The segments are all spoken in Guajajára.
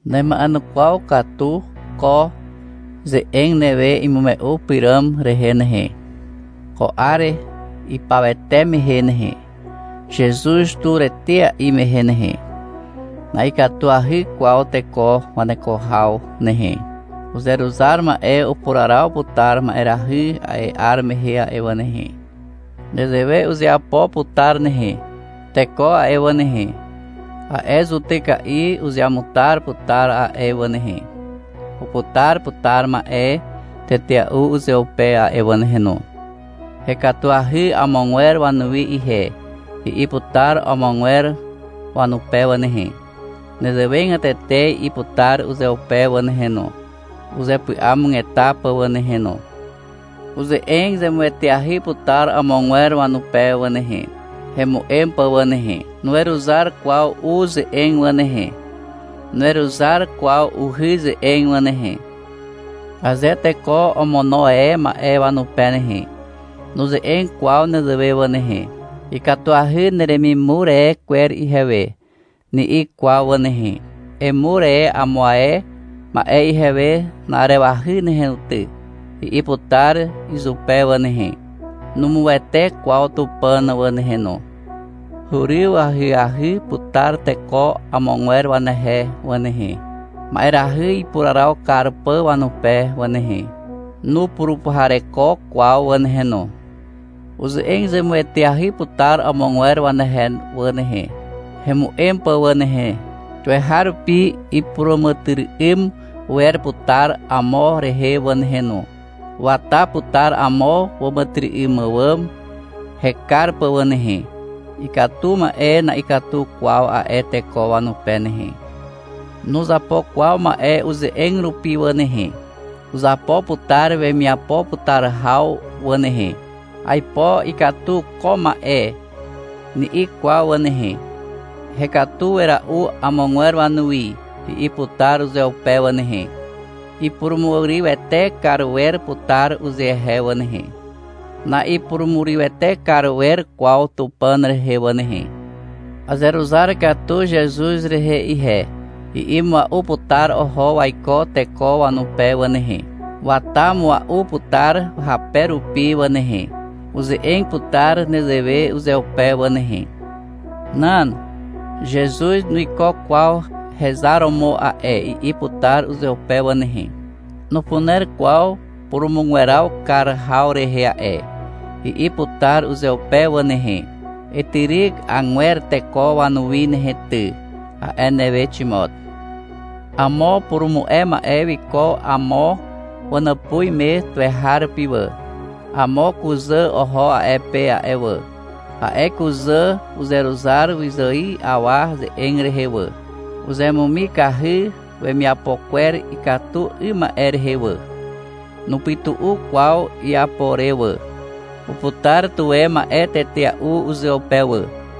Nema'enukwaw katu ko ze'eg newe imume'u pyràm rehe nehe. Ko 'ar ipawete mehe nehe, Zezuz tur etea'i mehe nehe, na'ikatuahy kwaw teko waneko haw nehe. Uzeruzar ma'e upuraraw putar ma'erahy a'e 'ar mehe a'e wà nehe. Nezewe uzeapo putar nehe. Teko a'e wà nehe, a'e zutyka'i uzeamutar putar a'e wà nehe. Uputar putar ma'e tetea'u uzeupe a'e wà nehe no. — Hekatuahy amogwer wanuwi ihe, i'i putar amogwer wanupe wà nehe. Nezewegatete i'i putar uzeupe wà nehe no, uzepy'amugeta pà wà nehe no. Uze'eg zemueteahy putar amogwer wanupe wà nehe, hemu'em pà wà nehe. Nuweruzar kwaw u ze'eg wà nehe. Nuweruzar kwaw uhy ze'eg wà nehe. Aze teko omono e ma'e wanupe nehe, nuze'eg kwaw nezewe wà nehe, — Ikatuahy neremimur e kwer ihewe, ni'i kwaw wà nehe. — Emur e amo ae ma'e ihewe na'arewahy nehe no ty, i'i putar izupe wà nehe. Numuwete kwaw Tupàn wà nehe no. Huryw ahyahy putar teko amogwer wanehe wà nehe, ma'erahy ipuraraw kar pà wanupe wà nehe. Nupurupuhareko kwaw wà nehe no. Uze'eg zemueteahy putar amogwer wanehe wà nehe, hemu'em pà wà nehe. Tuweharupi ipuràmàtyry'ym wer putar amo rehe wà nehe no. Wata putar amo wàmàtyry'ym àwàm hekar pà wà nehe. Ikatu ma'e na'ikatu kwaw a'e teko wanupe nehe. Nuzapo kwaw ma'e uze'eg rupi wà nehe. Uzapo putar wemiapo putar haw wà nehe. — Aipo ikatu ko ma'e, ni'i kwaw wà nehe. — Hekatu wera'u amogwer wanuwi, i'i putar uzeupe wà nehe. Ipurumurywete kar wer putar uzehe wà nehe, na'ipurumurywete kar wer kwaw Tupàn rehe wà nehe. — Azeruzar katu Zezuz rehe ihe, i'i mua'u putar oho waiko teko wanupe wà nehe. Wata mua'u putar hape rupi wà nehe. Uze'eg putar nezewe uzeupe wà nehe. — Nan, Zezuz nuiko kwaw hezar romo a'e, i'i putar uzeupe wà nehe. — Nupuner kwaw purumugweraw kar haw rehe a'e, i'i putar uzeupe wà nehe. — Etyryk agwer teko wanuwi nehe ty, a'e newe, Ximot. Amo upurumu'e ma'e wiko amo wanàpuz me tuweharupi wà. Amo kuzà oho a'e pe a'e wà. A'e kuzà uzeruzar wyzài awa ze'eg rehe wà. Uzemumikahy wemiapo kwer ikatu 'ym ma'e rehe wà. Nupytu'u kwaw iapo re wà. Uputar tuwe ma'e tetea'u uzeupe wà.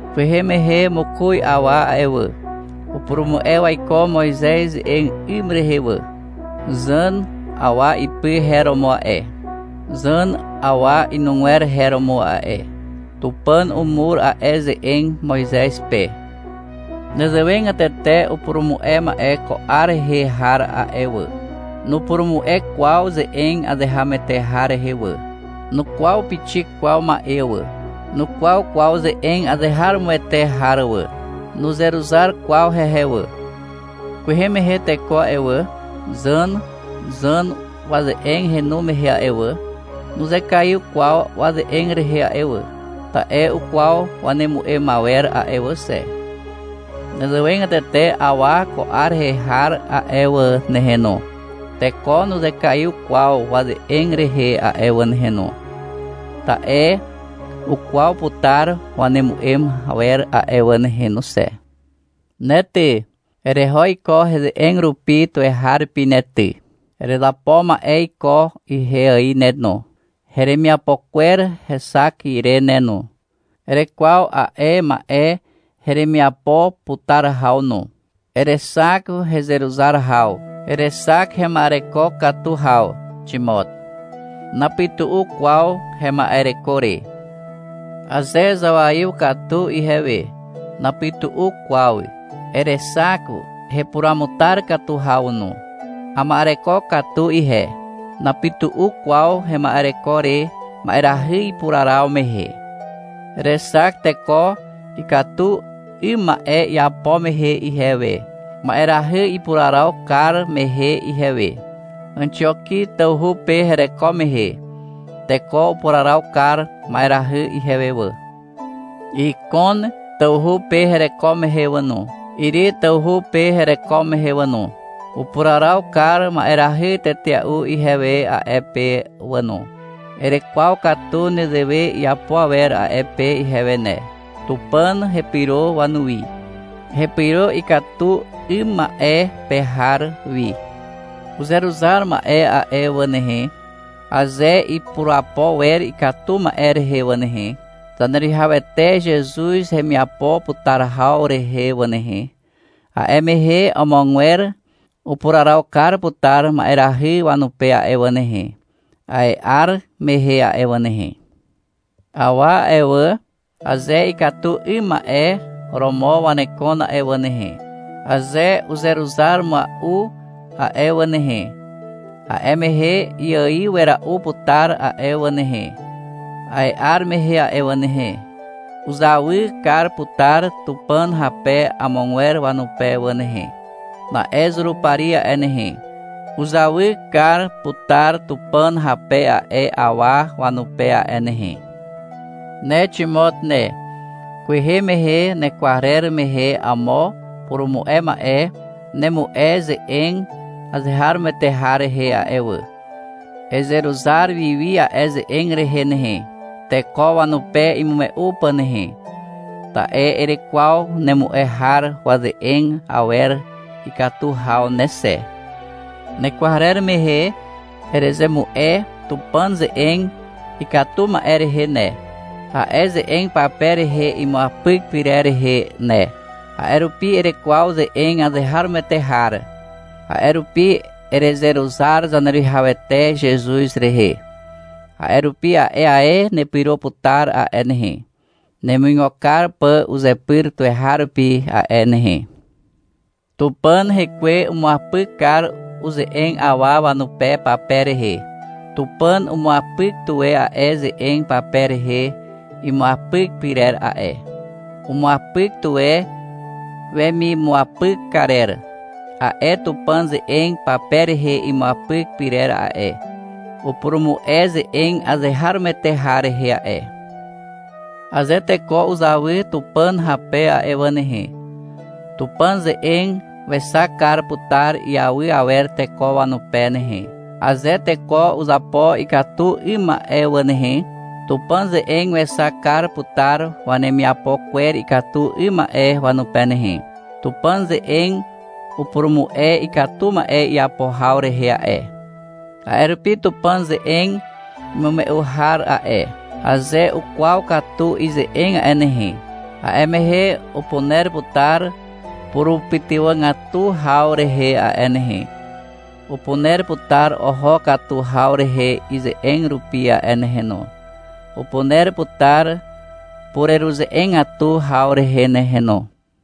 Kwehe mehe mokoz awa a'e wà, upurumu'e waiko Moizez ze'eg 'ym rehe wà. Zàn awa ipy her romo a'e. Zàm awa inugwer her romo a'e. Tupàn umur a'e ze'eg Moizez pe. Nezewegatete upurumu'e ma'e ko 'ar rehe har a'e wà, nupurumu'e kwaw ze'eg azeharomoete har rehe wà, nukwaw pixik kwaw ma'e wà. Nukwaw kwaw ze'eg azeharomoete har wà. Nuzeruzar kwaw hehe wà. Kwehe mehe teko a'e wà, Zàn, Zàm waze'eg henu mehe a'e wà, nuzekaiw kwaw waze'eg rehe a'e wà, ta'e ukwaw wanemu'em awer a'e wà xe. Nezewegatete awa ko 'ar rehe har a'e wà nehe no, teko nuzekaiw kwaw waze'eg rehe a'e wà nehe no, ta'e ukwaw putar wanemu'em awer a'e wà nehe no xe. Ne ty, ereho iko heze'eg rupi tuweharupi ne ty. Erezapo ma'e iko ihe ài ne no, heremiapo kwer hexak ire ne no. Erekwaw a'e ma'e heremiapo putar haw no. Erexak hezeruzar haw, erexak hema'ereko katu haw, Ximot. Napytu'u kwaw hema'ereko re. Aze zawaiw katu ihewe, napytu'u kwaw. Erexak hepuruamutar haw no. Ama'ereko katu ihe. Napytu'u kwaw hema'ereko re ma'erahy ipuraraw mehe. Erexak teko ikatu 'ym ma'e iapo mehe ihewe, ma'erahy ipuraraw kar mehe ihewe. Àxioki tawhu pe hereko mehe, teko upuraraw kar ma'erahy ihewe wà. Ikon tawhu pe hereko mehe wà no, Iri tawhu pe hereko mehe wà no, upuraraw kar ma'erahy tetea'u ihewe a'e pe wà no. Erekwaw katu nezewe iapo awer a'e pe ihewe ne. Tupàn hepyro wanuwi, hepyro ikatu 'ym ma'e a'e pe har wi. Uzeruzar ma'e a'e wà nehe, aze ipurapo wer ikatu ma'e rehe wà nehe, Zaneruwihawete Zezuz hemiapo putar haw rehe wà nehe, a'e mehe amogwer upuraraw kar putar ma'erahy wanupe a'e wà nehe, a'e 'ar mehe a'e wà nehe. Awa a'e wà, aze ikatu 'ym ma'e romo wanekon a'e wà nehe, aze uzeruzar mua'u a'e wà nehe, a'e mehe iaiw wera'u putar a'e wà nehe, a'e 'ar mehe a'e wà nehe. Uzawy kar putar Tupàn hape amogwer wanupe wà nehe. Na'e Zurupari a'e nehe, uzawy kar putar Tupàn hape a'e awa wanupe a'e nehe. Ne Ximot ne, kwehe mehe nekwarer mehe amo upurumu'e ma'e nemu'e ze'eg azeharomoete har rehe a'e wà. Ezeruzar wiwi a'e ze'eg rehe nehe, teko wanupe imume'u pà nehe, ta'e erekwaw nemu'e har waze'eg awer ikatu haw ne xe. Nekwarer mehe, erezemu'e Tupàn ze'eg ikatu ma'e rehe ne, a'e ze'eg pape rehe imuapyk pyrer rehe ne. A'e rupi erekwaw ze'eg azeharomoete har. A'e rupi erezeruzar Zaneruwihawete Zezuz rehe. A'e rupi a'e ae nepyro putar a'e nehe, nemuigo kar pà uzepyr tuweharupi a'e nehe. Tupàn Hekwe umuapyk kar uze'eg awa wanupe pape rehe. Tupàn umuapyk tuwe a'e ze'eg pape rehe imuapyk pyrer a'e. Umuapyk tuwe wemimuapyk karer. A'e Tupàn ze'eg pape rehe imuapyk pyrer a'e, upurumu'e ze'eg azeharomoete har rehe a'e. Aze teko uzawy Tupàn hape a'e wà nehe, Tupàn ze'eg wexak kar putar iawy awer teko wanupe nehe. Aze teko uzapo ikatu 'ym ma'e wà nehe, Tupàn ze'eg wexak kar putar wanemiapo kwer ikatu 'ym ma'e wanupe nehe. Tupàn ze'eg upurumu'e ikatu ma'e iapo haw rehe a'e. A'e rupi Tupàn ze'eg imume'u har a'e, aze ukwaw katu ize'eg a'e nehe, a'e mehe upuner putar purupytywàgatu haw rehe a'e nehe, upuner putar oho katu haw rehe ize'eg rupi a'e nehe no, upuner putar pureruze'egatu haw rehe nehe no.